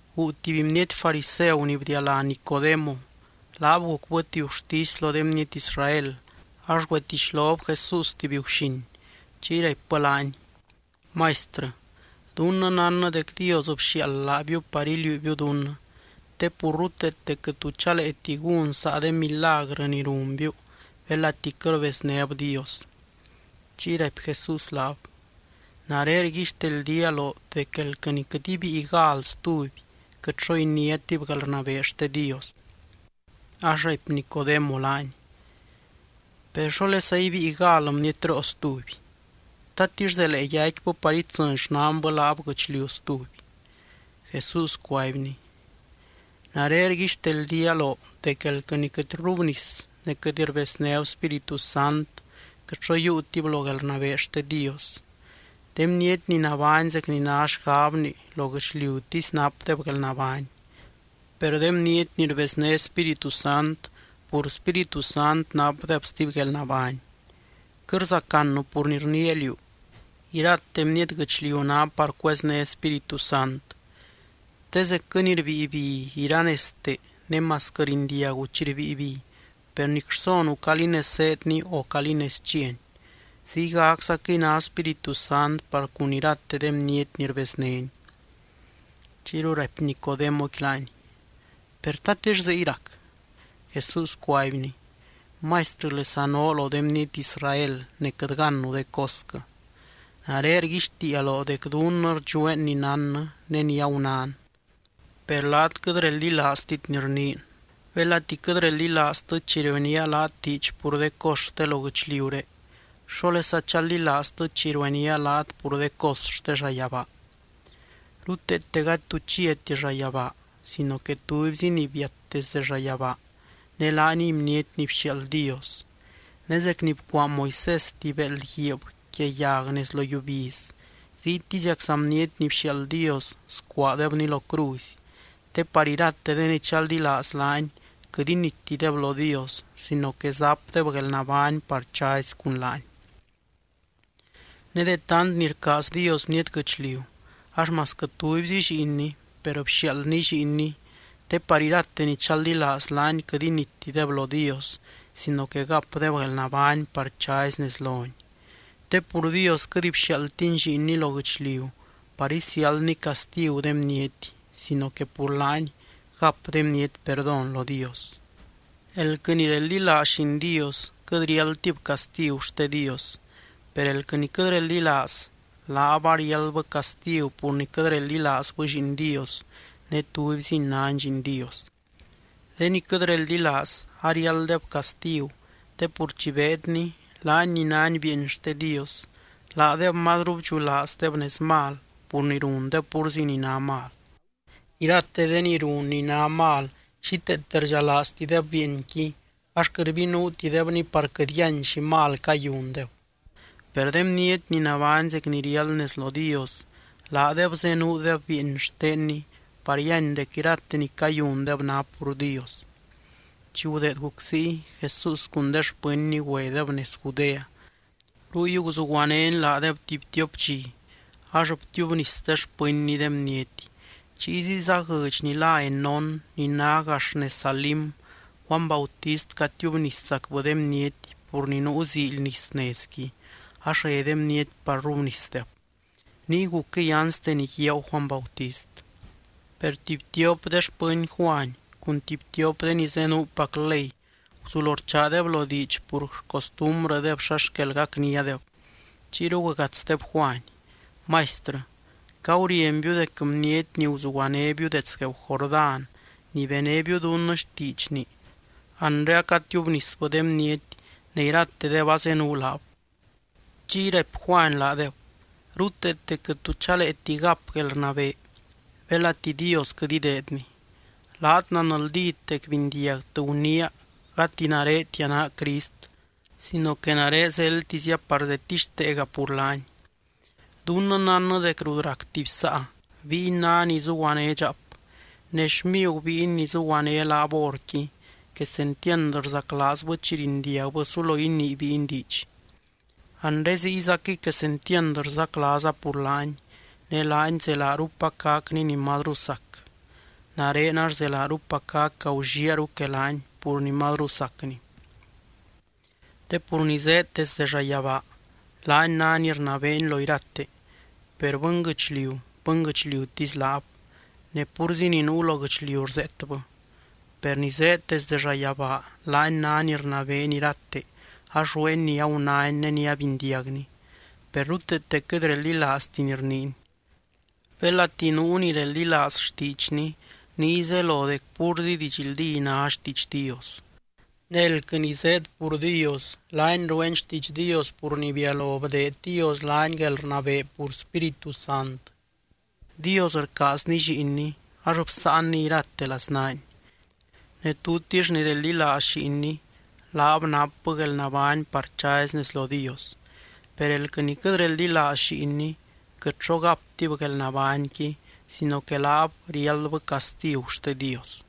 Guu tuby bniety fariseu ni bdialá Nicodemo. Laab gucbɨ tuby gurtisy lo de bniety Israel ax güetixlob Jesús tuby guxin. Chiy raipbɨ laany: —Maistrɨ, dunnɨ nánnɨ dec Dios bxiaald laabiu par iliuubiu dunnɨ, te pur ruteete quɨt tu chaleeti gún saa de milagrɨ ni runbiu belati quɨt rbeznéb Dios. Chiy raipy Jesús laab: —Nare rguixteldía loo dec elquɨ ni quɨt ibíi gal stuby, quɨt xo iniátib guelrnabee xte Dios. Ax raipy Nicodemo laany: —Per, ¿xólesa ibíi gal bnietroo stuby? ¿Tatix zelee yaicquibɨ par itsɨny xnanbɨ laab guɨchliu stuby? Jesús cuaibny: —Nare rguixteldía loo dec elquɨ ni quɨt rrubnis ne ni quɨt rbezné Spíritu Sant quɨt xo yiiutib lo guelrnabee xte Dios. De bniety ni nabány zec ni ná xgabni, lo guɨchliutisy napdeb guelnabány. Per de bniety ni rbezné Spíritu Sant pur Spíritu Sant napdeb stuby guelnabány. Quɨt rzacanu pur ni rniia liú: “Irate bniety guɨchliu ná par cuezné Spíritu Sant.” Te zecquɨ ni rbíi bi iranezte ne masquɨ rindiagu chi rbíi bi, per nic rsonu calí nez zéedni o calí nez chiani. Ziygaczaquɨy ná Spíritu Sant par cun irate de bniety ni rbeznény. Chiyru raipy Nicodemoqui laany: —Per, ¿tatix ziy rac? Jesús cuaibny: —¡Maistrɨlesa noo lo de bniety Israel, ne quɨt gannu de cosquɨ! Nare rguixtiia loo dec dunnɨ rdxueen ni nánnɨ ne ni agunán. Per laat quɨt reldilaaztit ni rniin. Belati quɨt reldilaaztɨ chi ruenía laat diidx pur de cos xte lo guɨchliuré, ¿xólesa chaldilaaztɨ chi ruenía laat pur de cos xte llayabaa? ’Ruteete gady tu chiati llayabaa sino que tubyzi ni biat desde llayabaa ne laaniy Bniety ni bxiaald Dios. Ne zec ni bcuaa Moisés tuby béeld guiib quia yag nez lo yiubiz, ziytiziacza Bniety ni bxiaald Dios scuaadebny lo cruzy, te par irate de ni chaldilaaz laany quɨt inittideb lo Dios sino que zapdeb guelnabány par chazy cun laany. ’Ne de tant ni rcaaz Dios bniety guɨchliu ax masquɨ tubyzi Lliinny, per bxiaaldny Lliinny te par irate ni chaldilaaz laany quɨt inittideb lo Dios sino que gapdeb guelnabány par chazy nez lony. Te pur Dios quɨt bxiaaldtiny Lliinny lo guɨchliu par isiáldny castigu de bniety sino que pur laany gap de bniety perdón lo Dios. ’Elquɨ ni reldilaaz Lliin Dios, quɨt riáldtib castigu xte Dios. Per elquɨ ni quɨt reldilaaz, laab ariáldbɨ castigu pur ni quɨt reldilaazbɨ Lliin Dios ne tubyziny nány Lliin Dios. De ni quɨt reldilaaz ariálddeb castigu te pur chi beedny, laany ni nány bieeny xte Dios, laadeb mazru bdxulaazdeb nez mal pur ni rundeb púrzi ni ná mal. Irate de ni run ni ná mal, xíteete rdxalaaztideb bieenqui ax quɨt rbinuutidebny par quɨt yíany xi mal cayundeb. Per de bniety ni nabány zec ni riáld nez lo Dios, laadeb zenuudeb bieeny xtenny par yíany dec irate ni cayundeb ná pur Dios. Chi gudeed guc ziy, Jesús cun de xpɨnny güedeb nez Judea. Ruy guzuguanény laadeb tuby tiop dxi ax btiubnis de xpɨnny de bniety. Chiy ziyza guɨdx ni lá Enón ni ná gax nez Salim, Juany Bautist catiubniszacbɨ de bniety pur ni nuu ziily nis nezqui ax re de bniety par rrubnisdeb. Niy gucquɨy anste ni guiagu Juany Bautist. Per tuby tiop de xpɨny Juany cun tuby tiop de ni zenuupac ley guzulo rchaadeb lo diidx pur xcostumbrɨdeb xa xquel gacniadeb. Chiyru güegatsdeb Juany: —Maistrɨ, caurienbiu dec bniety ni guzuguanébiu dets gueeu Jordán ni benébiu dunnɨ xtiidxni, anre acatiubnisbɨ de bniety ne iratedeb azenuu laab. Chiy raipy Juany laadeb: —Ruteete quɨt tu chaleeti gap guelrnabee belati Dios quɨt ideedni. Laat nanldít dec bindiagtɨ guniia gati naretia naa Crist sino que nare zeldtizia par zedtixteega pur laany. Dunnɨ nánnɨ dec rut rac tuby saa, bíiny ná ni zuguané dxaap. Ne xmigu bíiny ni zuguané laab horqui, quesentiand rzaclaazbɨ chi rindiagbɨ sulo inii bíiny diidx. Anre ziyzaquɨy quesentiand rzaclaaza pur laany, ne laany zelaarupac gacny ni mazru sac. Nare ax zelaarupac gaca gulliaaru que laany pur ni mazru sacny. Te pur ni zéed desde llayabaa, laany ná ni rnabeeny lo irate. Per bɨnguɨchliu, bɨnguɨchliutisy laab ne púrzi ni nuu lo guɨchliu rzeetbɨ. Per ni zéed desdɨ llayabaa laany ná ni rnabeeny irate ax rueeny ni agunány ne ni abindiagny. Per ruteete quɨt reldilaazti ni rniiny. Belati nuu ni reldilaaz xtiidxny, niy zelo dec púrzi didxldí ná xtiidx Dios. Ne elquɨ ni zéed pur Dios, laany rueeny xtiidx Dios pur ni bialo bdeed Dios laany guelrnabee pur Spíritu Sant. Dios rcaazny Lliinny ax bsáanny irate laznaany. Ne tutix ni reldilaaz Lliinny, laab napbɨ guelnabány par chazy nez lo Dios. Per elquɨ ni quɨt reldilaaz Lliinny, quɨt xo gaptib guelnabányqui sino que laab riáldbɨ castigu xte Dios.